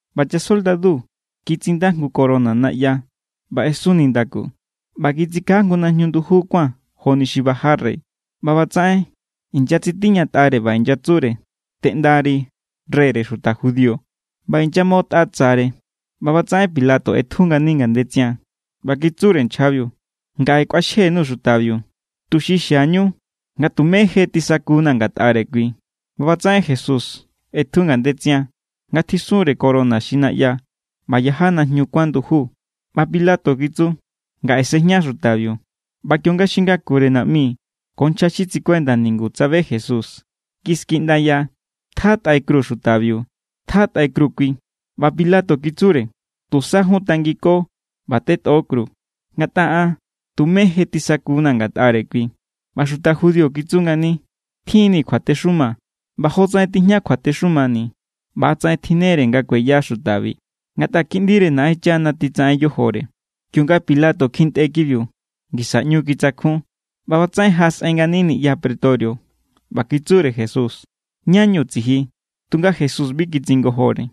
ꞌBa chasoldadu kitsinda jngu corona naꞌya ꞌba ꞌesun nindaku, ꞌba kitsikaja jngu najñu nduju kuán joni xi baja rey. ꞌBa ꞌbatsaꞌen inyatsitiñatꞌare ꞌba inyatsure: —¡Teꞌndari, reyre xuta judío! ꞌBa inyamoꞌotꞌa tsare. ꞌBa ꞌbatsaꞌen Pilato ꞌetju ngani ngandetsian ꞌba kitsure nchjabiu: —Ngaꞌe kꞌuaxje_nuu̱ xutabiu, tuxi xiañu nga tumé je tisakuna̱ ngatꞌare kui. ꞌBa ꞌbatsaꞌen Jesús ꞌetju ngandetsian nga tjiꞌsunre corona xi naꞌya ꞌba yaja najñu nduju kuon. ꞌBa Pilato kitsu: —¡Ngaꞌe sejña xutabiu! ꞌBa kionga xi ngakure naꞌmi ko nchja xi tsikuenda ningu tsabe Jesús, kiskiꞌndaya: —¡Tjatꞌai kru xutabiu! ¡Tjatꞌai kru kui! ꞌBa Pilato kitsure: —Tusa jun tangiko ꞌba tetꞌo kru, ngatꞌa an tumé je tisakuna̱ ngatꞌare kui. ꞌBa xuta judío kitsu ngani: —Tjin=ni̱ kjuatexuma, ꞌba jotsaꞌen tijña kjuatexumani̱ ꞌba=tsaꞌen tjinnere nga kueya xutabi, ngatꞌa Kiꞌndire Naꞌenchana titsaꞌen yojore. Kionga Pilato kjintꞌe kibiu, ngisa ꞌñu kitsakjun. ꞌBa ꞌbatsaꞌen jaꞌasꞌen ngani niꞌya pretorio ꞌba kitsure Jesús: —¿Ñá=ñu tsiji? Tunga Jesús bi kitsingojore.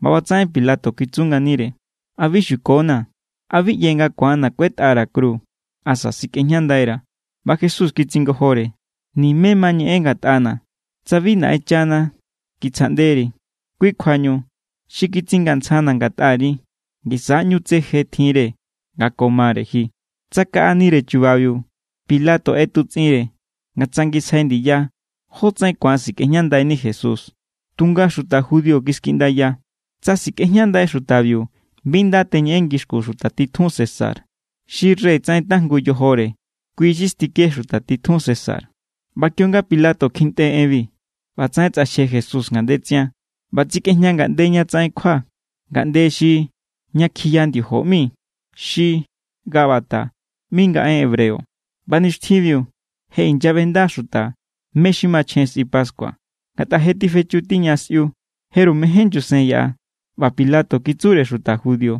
ꞌBa ꞌbatsaꞌen Pilato kitsu nganire: —¿A bi xukonaa̱? ¿A bi ꞌye nga ku̱anna̱ kuetꞌara̱ kru asa sikꞌejñandaira̱? ꞌBa Jesús kitsingojore: —Nime ma ñeꞌen ngatꞌana̱ tsa bi Naꞌenchana kitsjaꞌnderi. Kui kjuañu, xi kitsingantsjana̱ ngatꞌari ngisa= ꞌñu tse je tjinre nga ko mare ji. Tsakaꞌanire chubabiu Pilato ꞌetutsꞌinre nga tsangisjai ndiya jótsaꞌen ku̱an sikꞌejñandai Jesús. Tunga xuta judío kiskiꞌndaya: —¡Tsa sikꞌejñandai xutabiu, bi nda teñeꞌen ngixkun xuta titjun César! ¡Xi rey tsaꞌen tajngu yojore, kui= xi stike xuta titjun César! ꞌBa kionga Pilato kjintꞌe enbi, ꞌbatsaꞌen tsꞌaxje Jesús ngandetsian ꞌba tsikꞌejña ngaꞌnde ña tsaꞌen kjua, ngaꞌnde xi “Ña kjiya ndiojo” ꞌmi, xi Gabata ꞌmi nga en hebreo. ꞌBa nixtjinbiu je inyaꞌbenda xuta mé= xi machjen sꞌi pascua, ngatꞌa je tifechu tiña sꞌiu. Jeru mején nyusen yaꞌa. ꞌBa Pilato kitsure xuta judío: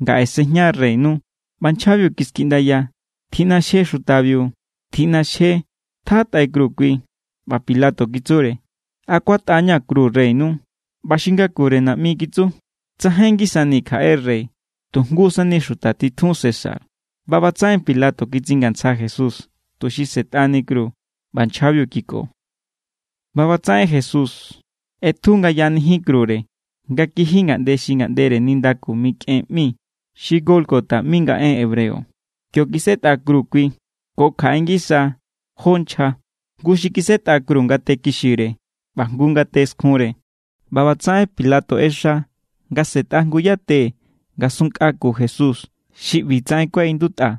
—¡Ngaꞌe sejña reynu! ꞌBa nchjabiu kiskiꞌndaya: —¡Tjiꞌnaxje xutabiu! ¡Tjiꞌnaxje! ¡Tjatꞌai kru kui! ꞌBa Pilato kitsure: —¿A kuatꞌa=ña̱ kru reynu? ꞌBa xi ngakure naꞌmi kitsu: —¡Tsajain ngisani̱ kjaꞌe rey, tu jngu sani xuta titjun César! ꞌBa ꞌbatsaꞌen Pilato kitsingantsja Jesús, tuxi sꞌe̱tꞌani kru, ꞌba nchjabiu kiko. ꞌBa ꞌbatsaꞌen Jesús ꞌetju nga yaꞌanijin krure nga kiji ngaꞌnde xi ngaꞌndere nindaku mikꞌen ꞌmi (xi Gólgota ꞌmi nga en hebreo). Kio kisetꞌa kru kui ko kjaꞌe ngisa jó nchja. Jngu xi kisetꞌa kru ngate kixire ꞌba jngu ngate skjunre. ꞌBa ꞌbatsaꞌen Pilato ꞌexa nga se̱tꞌa jngu yate ngasunnkꞌa ku Jesús. Xi ꞌbitsaꞌen kuaꞌindutꞌa: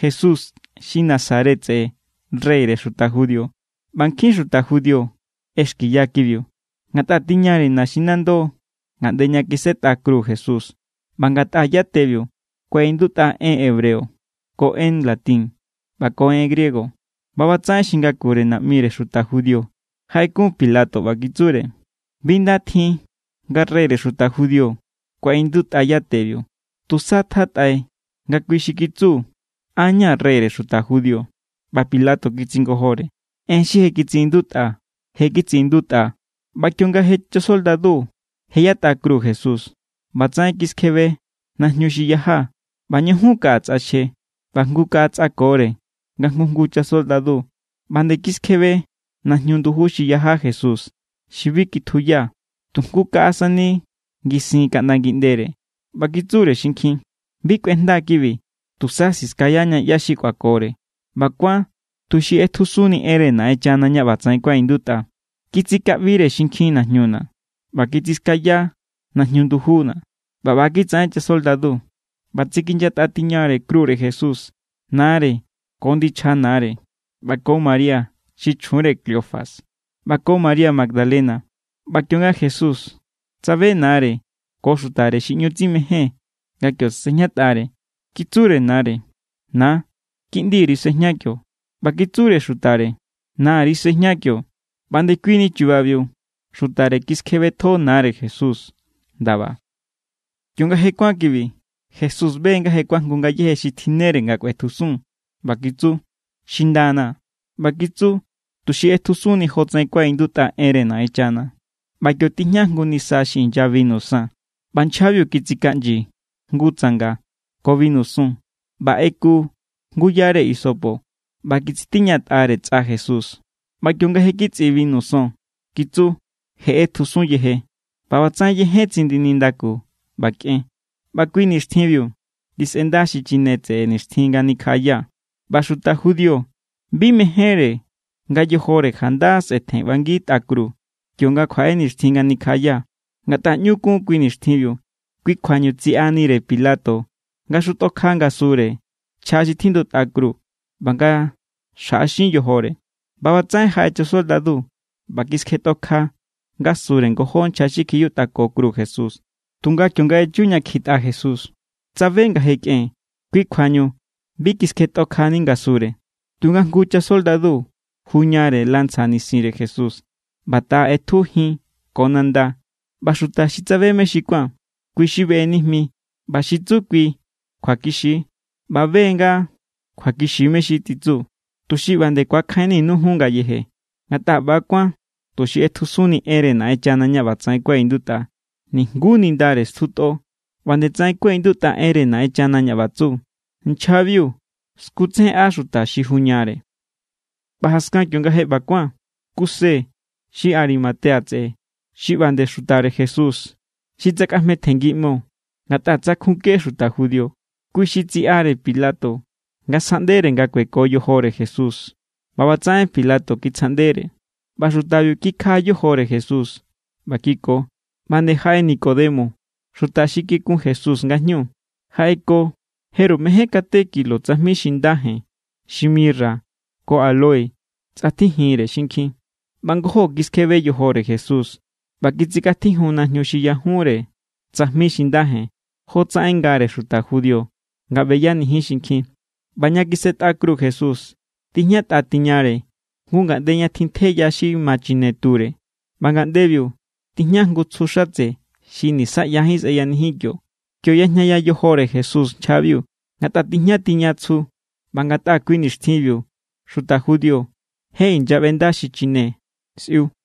“Jesús xi Nazaret tseꞌe, reyre xuta judío.” ꞌBa nkjin xuta judío ꞌexkiya kibiu, ngatꞌa tiñare naxinando ngaꞌnde ña kisetꞌa kru Jesús ꞌba ngatꞌa yatebiu kuaꞌindutꞌa en hebreo ko en latín ꞌba ko en griego. ꞌBa ꞌbatsaꞌen xi ngakure naꞌmire xuta judío jaꞌekun Pilato ꞌba kitsure: —Bi nda tjin nga: “Reyre xuta judío”, kuaꞌindutꞌa yatebiu. Tusa tjatꞌai nga: “Kui xi kitsu: An= ña̱ reyre xuta judío.” ꞌBa Pilato kitsingojore: —En xi je kitsiꞌindutꞌaa̱, je kitsiꞌindutꞌaa̱. ꞌBa kionga je chasoldadu je yatꞌa kru Jesús, ꞌbatsaꞌen kiskjebe najñu xi yaja ꞌba ñujun kaꞌa tsꞌaxje. ꞌBa jngu kaꞌa tsꞌakore nga jngu jngu chasoldadu. ꞌBa nde kiskjebe najñu nduju xi yaja Jesús xi bi kitjuya, tu jngu kaꞌa sani ngisin kaꞌnda ngiꞌndere. ꞌBa kitsure xinkjin: —Bi kꞌuejnda kibi. Tusa siskayaña ꞌyá xi kꞌuakore. ꞌBa kuán tuxi ꞌetjusunni enre Naꞌenchana ña ꞌbatsaꞌen kuaꞌindutꞌa: “Kitsikaꞌbire xinkjin najñuna̱ ꞌba kitsiskaya najñu ndujuna̱.” ꞌBa ꞌba= kitsaꞌen chasoldadu. ꞌBa tsikinyatꞌa tiña krure Jesús nare ko ndichja nare ꞌba ko María xi chjunre Cleofas ꞌba ko María Magdalena. ꞌBa kionga Jesús tsabe nare ko xutare xi ꞌñu tsimején nga kio sejñatꞌare, kitsure nare: —Na, kiꞌndiri sejña kio. ꞌBa kitsure xutare: —Nari sꞌejña kio. ꞌBa ndekuini chubabiu xutare kiskjebetjo nare Jesús ndaba. Kionga je kuán kibi, Jesús be nga je kuajngu ngayéje xi tjinnere nga kꞌuetjusun ꞌba kitsu: —Xindana̱ ꞌBa kitsu, tuxi ꞌetjusunni jotsaꞌen kuaꞌindutꞌa enre Naꞌenchana. ꞌBa kio tijña jngu nisa xi inya binu san. ꞌBa nchjabiu kitsikaꞌnyi jngu tsanga ko binu son ꞌba ꞌeku jngu yare hisopo ꞌba kitsitiñatꞌare tsꞌa Jesús. ꞌBa kionga je kitsꞌi binu son kitsu: —Je= ꞌetjusun yeje. ꞌBa ꞌbatsaꞌen yejen tsindi nindaku ꞌba kꞌen. ꞌBa kui nixtjinbiu tisꞌenda xichine xi tseꞌe nixtjin nga nikjaꞌaya. ꞌBa xuta judío bi mejénre nga yojore janda sꞌetjen ꞌbangi tꞌa kru kionga kjuaꞌe nixtjin nga nikjaꞌaya, ngatꞌa ꞌñu kun kui nixtjinbiu. Kui kjuañu tsiꞌanire Pilato nga xutꞌokja ngasure nchja xi tjindutꞌa kru ꞌba nga xjaꞌaxin yojore. ꞌBa ꞌbatsaꞌen jaꞌe chasoldadu ꞌba kiskjetꞌokja ngasure ngojó nchja xi kjiyutꞌako kru Jesús. Tunga kionga echu ña kjitꞌa Jesús, tsabe nga je kꞌen. Kui kjuañu bi kiskjetꞌokjani ngasure. Tunga jngu chasoldadu juñare lanza nisinre Jesús, ꞌba taꞌa ꞌetju jin ko nanda. ꞌBa xuta xi tsabe mé= xi kuán, kui= xi beꞌenijmi ꞌba xi tsu kui kjuakixi=. ꞌBa be= nga kjuakixi mé= xi titsu, tuxi ꞌba nde ku̱akjainninu jun ngayeje. Ngatꞌa ꞌba kuán tuxi ꞌetjusunni enre Naꞌenchana ña ꞌbatsaꞌen kuaꞌindutꞌa: “Nijngu nindare stjutꞌo.” ꞌBa nde tsaꞌen kuaꞌindutꞌa enre Naꞌenchana ña ꞌba tsu: “Nchjabiu skutsejenꞌa xuta xi juñare.” ꞌBa jaskan kionga je ꞌba kuán, Kuse xi Arimatea tseꞌe, xi ꞌba nde xutare Jesús xi tsakꞌajmetjenngiꞌmo ngatꞌa tsankjunke xuta judío, kui xi tsiꞌare Pilato nga sjaꞌndere nga kueko yojore Jesús. ꞌBa ꞌbatsaꞌen Pilato kitsjaꞌndere, ꞌba xutabiu kikjaꞌa yojore Jesús ꞌba kiko. ꞌBa nde jaꞌe Nicodemo, xuta xi kikun Jesús nga jñu, jaꞌeko jeru mején kate kilo tsajmi xi nda jen xi mirra ko áloe tsꞌatjijinre xinkjin. ꞌBa ngojó kiskjebe yojore Jesús ꞌba kitsikꞌatjijun najñu xi yajunre tsajmi xi nda jen, jotsaꞌen ngare xuta judío nga beyanijin xinkjin. ꞌBa ña kisetꞌa kru Jesús, tijñatꞌa tiñare jngu ngaꞌnde ña tjintje ya xi ma chine ture. ꞌBa ngaꞌndebiu tijña jngu tsju xatse xi nisaꞌyajín sꞌeyanijin kio. Kio yajñaya yojore Jesús nchjabiu, ngatꞌa tijña tiña tsju ꞌba ngatꞌa kui nixtjinbiu xuta judío je inyaꞌbenda xichine sꞌiu.